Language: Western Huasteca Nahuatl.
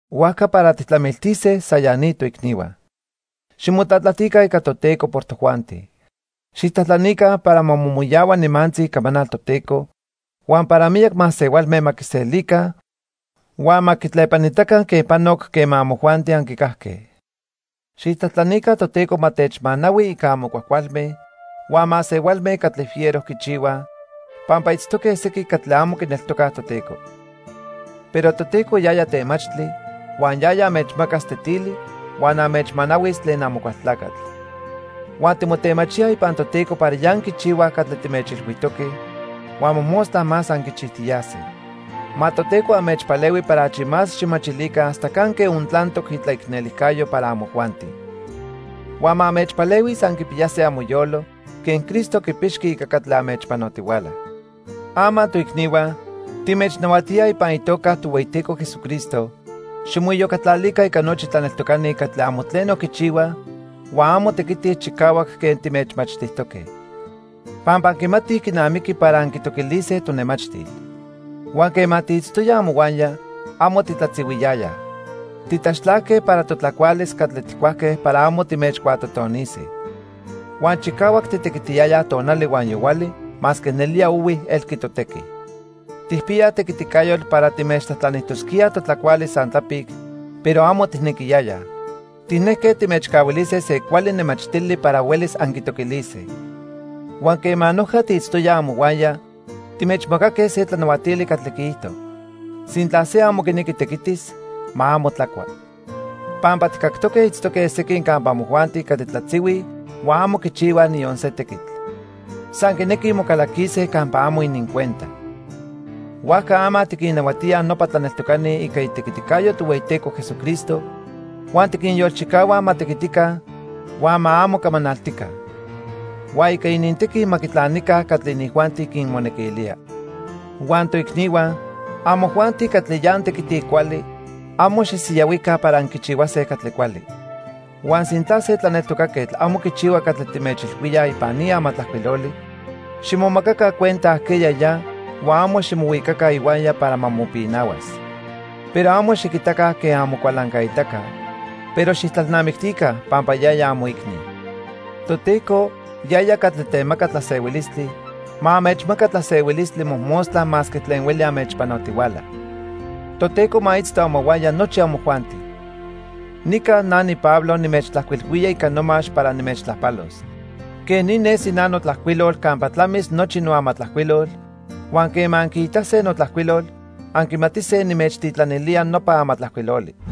Huajca para tijtlamiltise san ya ni, toicnihua. Ximotlatlajtica ica Toteco por tojuanti. Xijtlajtlanica para ma momoyahua nimantzi icamanal Toteco huan para miyac masehualme ma quiselica huan ma quitlepanitaca quen panoc quema amojuanti anquicajque. Xijtlajtlanica Toteco ma techmanahui ica amo cuajcualme huan masehualme catli fiero quichihuaj, pampa itztoque sequin catli amo quineltocaj Toteco. Pero Toteco yaya temachtli huan yaya anmechmacas tetili huan anmechmanahuis tlen Amocualtlacatl. Huan timotemachíaj ipan Toteco para ya anquichihuaj catli timechilhuijtoque, huan mojmostla más anquichijtiyase. Ma Toteco anmechpalehui para achi más xijmachilica hasta canque ontlantoc itlaicnelijcayo para amojuanti. Huan ma anmechpalehuis anquipiyase amoyolo quen Cristo quipixqui ica catli anmechpanotihuala. Ama toicnihua, timechnahuatíaj ipan itoca Tohueyiteco Jesucristo, ximoiyocatlalica ica nochi tlaneltocani catli amo tleno quichihuaj huan amo tequitij chicahuac quen timechmachtijtoque. Pampa anquimatij quinamiqui para anquitoquilise tonemachtil. Huan quema tiitztoyaj amohuaya, amo titlatzihuiyayaj. Titlaxtlajque para totlacualis catli tijcuajque para amo timechcuatotonise. Huan chicahuac titequitiyayaj tonali huan yohuali masque nelía ohui elqui totequi. Tijpiyaj tequiticayotl para timechtlajtlanijtosquíaj totlacualis san tlapic, pero amo tijnequiyayaj. Tijnejque timechcahuilise se cuali nemachtili para huelis anquitoquilise. Huan quema noja tiitztoyaj amohuaya timechmacaque se tlanahuatili catli quiijto: Sintla se amo quinequi tequitis, ma amo tlacua. Pampa tijcactoque itztoque sequin campa amojuanti catli tlatzihuij huan amo quichihuaj niyon se tequitl. San quinequij mocalaquise campa amo inincuenta. Huajca ama tiquinnahuatíaj nopa tlaneltocani ica itequiticayo Tohueyiteco Jesucristo huan tiquinyolchicahua ma tequitica huan ma amo camanaltica. Huan ica inintequi ma quitlanica catli inijuanti quinmonequilía. Huan toicnihua, amojuanti catli ya antequitij cuali, amo xisiyahuica para anquichihuase catli cuali. Huan sintla se tlaneltocaquetl amo quichihua catli timechilhuíaj ipan ni amatlajcuiloli, ximomacaca cuenta ajqueya ya huan amo ximohuicaca ihuaya para ma mopinahuas. Pero amo xiquitaca quen amocualancaitaca, pero xijtlalnamictica pampa yaya amoicni. Toteco, yaya catli temaca tlasehuilistli, ma anmechmaca tlasehuilistli mojmostla masque tlen hueli anmechpanotihuala. Toteco ma itzto amohuaya nochi amojuanti. Nica na niPablo nimechtlajcuilhuía ica nomax para nimechtlajpalos. Quej ni nesi na notlajcuilol campa tlamis nochi noamatlajcuilol, huan quema anquiitase notlajcuilol, anquimatise nimechtitlanilía nopa amatlajcuiloli.